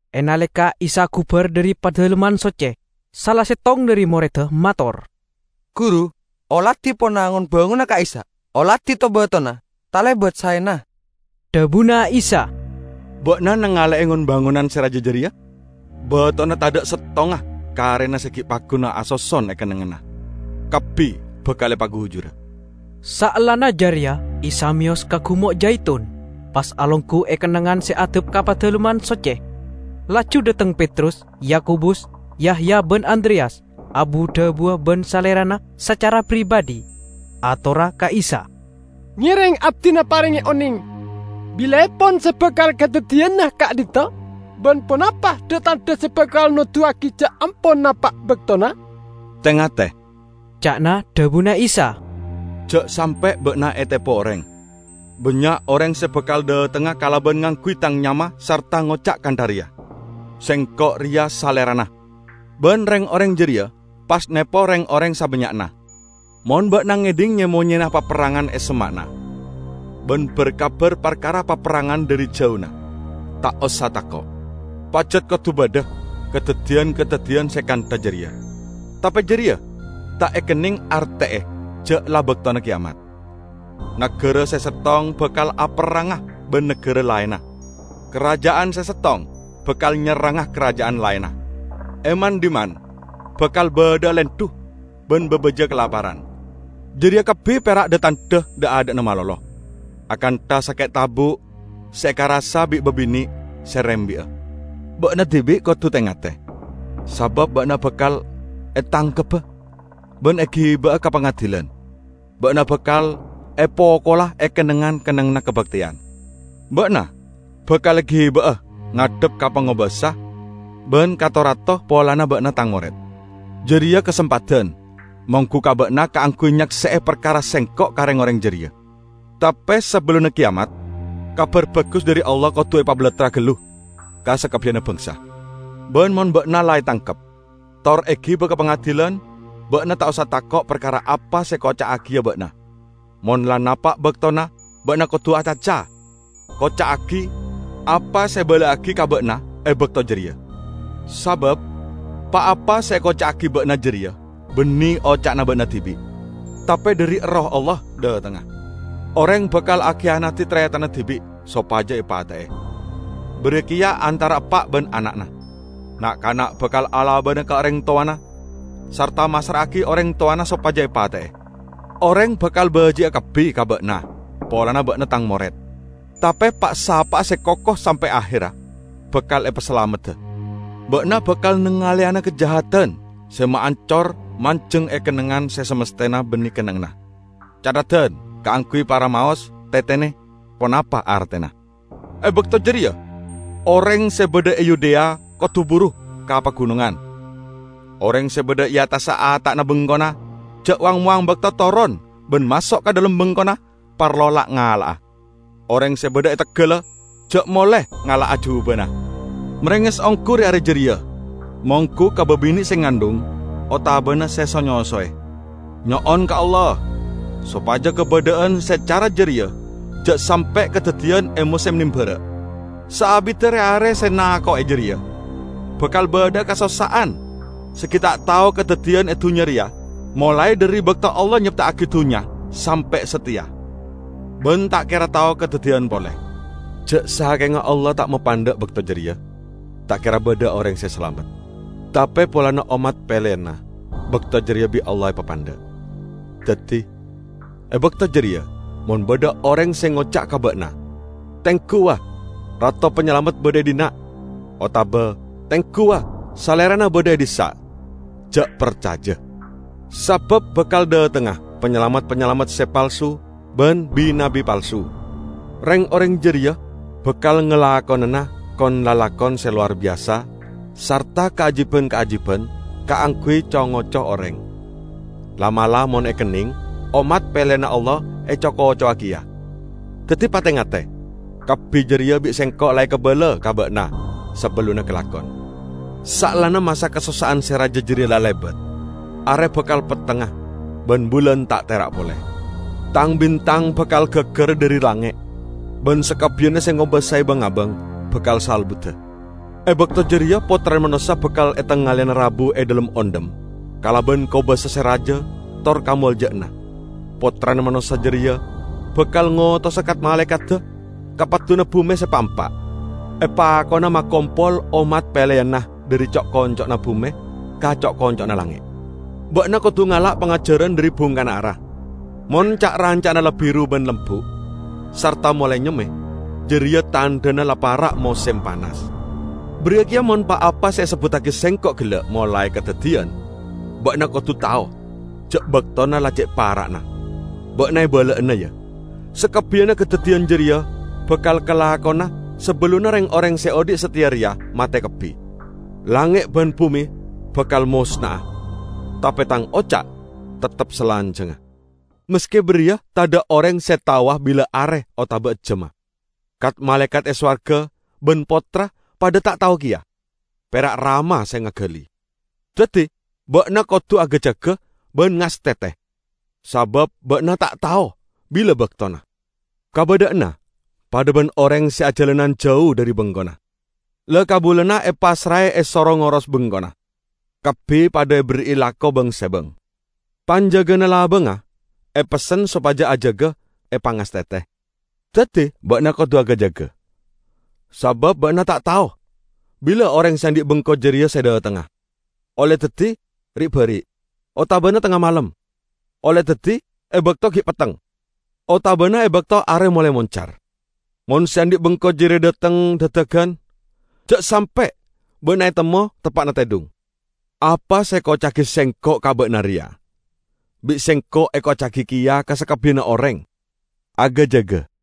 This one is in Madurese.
E naleka Isa gubar dhari Padalemman Socce, sala settong dhari moredda mator, "Guru, oladi pona ngon-bangonan ka'issa'. Oladi to-batona. Talebat saena!" Dhabuna Isa, "Ba'na nangale'e ngon-bangonan se raja jareya? Batona tadha' settonga karena se gi' pagguna asoson e kennengnganna. Kabbi bakal epagujura." Saellana jareya Isa meyos ka Gumo' Jaitun, pas alonggu e kennengngan se addhep ka Padalemman Socce. Laju dhateng Petrus, Yakobus, Yahya ban Andreyas, abu-dhabuwa ban Salerana sacara pribadhi. Atorra ka Isa, "Ngereng abdina parenge oneng, bilaepon se bakal kadaddiyana ka'dhinto'? Ban ponapa dha-tandha se bakal noduwagi ja' ampon napa' baktona?" "Te-ngate," ca'na dhabuna Isa, "ja' sampe' ba'na etepo oreng. Bannya' oreng se bakal dhatengnga kalaban ngangguy Tang nyama sarta ngoca' kantha reya, 'Sengko' reya Salerana!' ban reng-oreng jareya pas nepo reng-oreng sabannya'na. Mon ba'na ngedhing nye-monyena paperrangan e semma'na ban bar-kabar parkara paperrangan dhari jauna, ta' osa tako'. Pajat kodu badha kadaddiyan-kadaddiyan se kantha jareya, tape jareya ta' ekenneng arte'e ja' la baktona keyamat. Nagara se settong bakal aperranga ban nagara laenna. Karaja'an se settong bakal nyerranga karaja'an laenna. E man-dhimman bakal badha'a lendhu ban babaja kalaparan. Jareya kabbi pera' dha-tandha dha'-adha'na malolo, akantha sake' tabu' se ekarassa bi' babine' se rembi'a. Ba'na dibi' kodu te-ngate, sabab ba'na bakal etangkebba ban egiba'a ka pangadilan. Ba'na bakal epokola e kennengngan-kennengnganna kabakteyan. Ba'na bakal egiba'a ngadhep ka pangobasa ban ka to-rato polana ba'na Tang mored. Jareya kasempadan monggu ka ba'na kaangguy nyakse'e parkara Sengko' ka reng-oreng jareya. Tape sabellunna keyamat Kabar Bagus dhari Allah kodu epabalattra gallu ka sakabbiyanna bangsa. Ban mon ba'na la etangkep tor egiba ka pangadilan, ba'na ta' osa tako' parkara apa se ekoca'agiya ba'na; mon la napa' baktona ba'na kodu acaca, koca'agi apa se ebala'agi ka ba'na e bakto jareya. Sabab pa-apa se ekoca'agi ba'na jareya banne oca'na ba'na dibi', tape dhari Erroh Allah dhatengnga. Oreng bakal akiyanadi taretanna dibi' sopaja epate'e, bariya keya antara eppa' ban ana'na. Na'-kana' bakal alabana ka oreng towana sarta massra'agi oreng towana sopaja epate'e. Oreng bakal baji'a kabbi ka ba'na polana ba'na Tang mored. Tape pa'-sapa'a se koko sampe' aherra, bakal epasalamedda." "Ba'na bakal nangaleyana 'Kajahadan se maancor' manjeng e kennengngan se masthena banne kennengnganna. (Catheddan kaangguy para maos: tetene ponapa artena!) E bakto jareya oreng se badha e Yudea kodu buru ka pagunongan. Oreng se badha e attassa ata'na bengkona ja' wang-mowang bakto toron ban maso' ka dhalem bengkona parlo la'-ngala'a. Oreng se badha e teggalla ja' mole ngala'a jubana. Marenges onggu re-are jareya monggu ka babine' se ngandhung otabana se so-nyosowe! Nyo'on ka Allah sopaja kabadha'an se cara jareya ja' sampe' kadaddiyan e mosem nambara'. Saabidda re-are se nako'e jareya bakal badha'a kasossa'an se gi' ta' tao kadaddiyan e dunnya reya molae dhari bakto Allah nyepta'agi dunnya sampe' sateya, ban ta' kera tao kadaddiyan pole. Ja' sakenga Allah ta' mapandha' bakto jareya, ta' kera badha oreng se salamet. Tape polana ommat peleyanna, bakto jareya bi' Allah epapandha'. Daddi, e bakto jareya mon badha oreng se ngoca' ka ba'na, 'Tenggu, wa, Rato Panyalamet badha e dhinna'!' otaba, 'Tenggu, wa, Salerana badha e dhissa'!' -- ja' parcaja. Sabab bakal dhatengnga panyalamet-panyalamet se palsu ban bi-nabbi palsu. Reng-oreng jareya bakal ngalakonana kon-lalakon se lowar biyasa sarta kaajiban-kaajiban kaangguy co-ngoco oreng, la'-mala' mon ekenneng, ommat peleyanna Allah eco-kocowa keya. Daddi pate-ngate! Kabbi jareya bi' Sengko' la ekabala ka ba'na sabellunna kalakon." "Saellana masa kasossa'an se raja jareya la lebat, are bakal pettengnga ban bulan ta' tera' pole. Tang-bintang bakal gaggara dhari langnge', ban sakabbiyanna se ngobasae bang-abang bakal salbuda. E bakto jareya Pottrana Manossa bakal etangaleyana rabu e dhalem ondhem kalaban kobasa se raja tor kamolja'anna. Pottrana Manossa jareya bakal ngotosa kat-malaekadda ka padduna bume se pa'-empa', epakona makompol ommat peleyanna dhari co'-konco'na bume ka co'-konco'na langnge'." "Ba'na kodu ngala' pangajaran dhari bungkana ara. Mon ca'-ranca'na la biru ban lembu', sarta molae nyemme, jareya tandhana la para' mosem panas. Bariya keya mon pa-apa se esebbuttagi Sengko' gella' molae kadaddiyan, ba'na kodu tao ja' baktona la ce' para'na. Ba'na ebala'ana, ya, sakabbiyanna kadaddiyan jareya bakal kalakona sabellunna reng-oreng se odhi' sateya reya mate kabbi. Langnge' ban bume bakal mosna'a, tape Tang oca' teptep salanjangnga." "Maske bariya, tadha' oreng se taowa bila are otama ejjamma. Kat-malaekat e sowarga ban Pottra padha ta' tao keya. pera' Rama se ngagali. Daddi ba'na kodu aga-jaga ban ngastete, sabab ba'na ta' tao bila baktona. Kabadha'anna padha ban oreng se ajalanan jau dhari bengkona. La-kabulana epassrae esoro ngoros bengkona, kabbi padha eberri'i lako bang-sebang. Panjagana labangnga epessen sopaja ajaga epangastete. Daddi ba'na kodu aga-jaga, sabab ba'na ta' tao bila oreng se andhi' bengko jareya se dhatengnga, olle daddi ri'-bari' otabana tengnga malem, olle daddi e bakto gi' petteng, otabana e bakto are molae moncar. Mon se andhi' bengko jareya dhateng dadagan, ja' sampe' ba'na etemmo teppa'na tedhung. Apa se ekoca'agi Sengko' ka ba'na reya, bi' Sengko' ekoca'agi keya ka sakabbiyanna oreng: aga-jaga!"